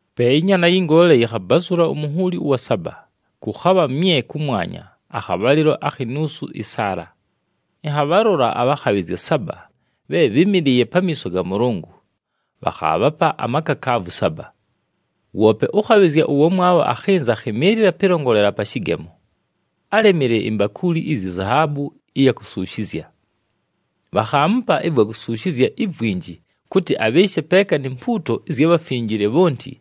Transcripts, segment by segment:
Pe ɨNyaana yɨ Ngoole yɨkhabazʉla umunhuuli ʉwa saba, kʉkhabha mye kʉmwanya akhabhalɨlo akhi nuusu ɨsaala. Ɨnhabhalola abhakhabhɨzya saba bhe bhɨ́mɨlɨɨye pamiiso ga Mʉlʉngʉ, bhakhaabhapa amakakaavu saba. Woope ʉkhabhɨzya ʉwamwabho akhɨnza akhɨmɨɨlɨla pɨlongolela pa shɨgemo. Álemile imbakuuli iyi zahaabu ɨya kusuushizya. Bhakhaamupa ɨvwa kusuushizya ivwinji kʉtɨ abhɨɨshe peeka ni mpuuto ɨzya bhafinjile bhonti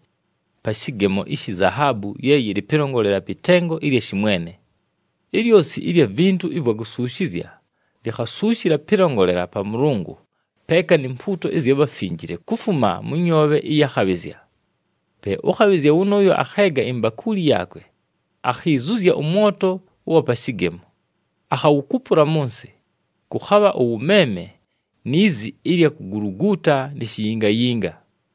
pa shɨgemo ishi zahaabu ye yɨlɨ pɨlongolela pɨ tengo ɨlya shɨmwene. Ilyosi ɨlya vintu ɨvwa kusuushizya likhasuushila pɨlongolela pa Mʉlʉngʉ peeka ni mpuuto ɨzya bhafinjile, kufuma mʉ nyoobhe ɨya khabhɨzya. Pe ʉkhabhɨzya wʉnʉʉyo akheega imbakuuli yaakwe, akhizuzya ʉmwoto ʉwa pa shɨgemo, akhawukupula mʉ nsɨ. Kʉkhabha ʉwʉmeeme ni zi ɨlya kuguluguuta ni shiyingayinga.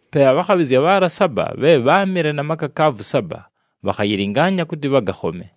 Pe abhakhabhɨzya bhaala saba bhe bháamɨle na makakaavu saba bhakhayɨlɨngaanya kʉtɨ bhagakhome.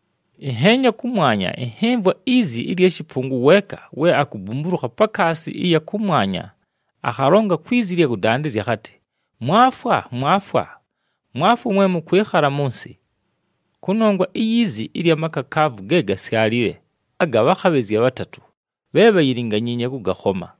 Ɨnheenya kʉmwanya, ɨnhɨmvwa izi ɨlya shɨpʉngʉ weeka we akubumbulukha pakaasi ɨya kʉmwanya, akhalonga kwi zi ɨlya kʉdandɨzya akhatɨ, “Mwafwa! Mwafwa! Mwafwa mwe mʉkwɨkhala mʉ nsɨ! Kʉnongwa iyi zi ɨlya makakaavu ge gasyalile aga bhakhabhɨzya bhatatʉ, bhe bhayilinganyiinye kʉgakhoma.”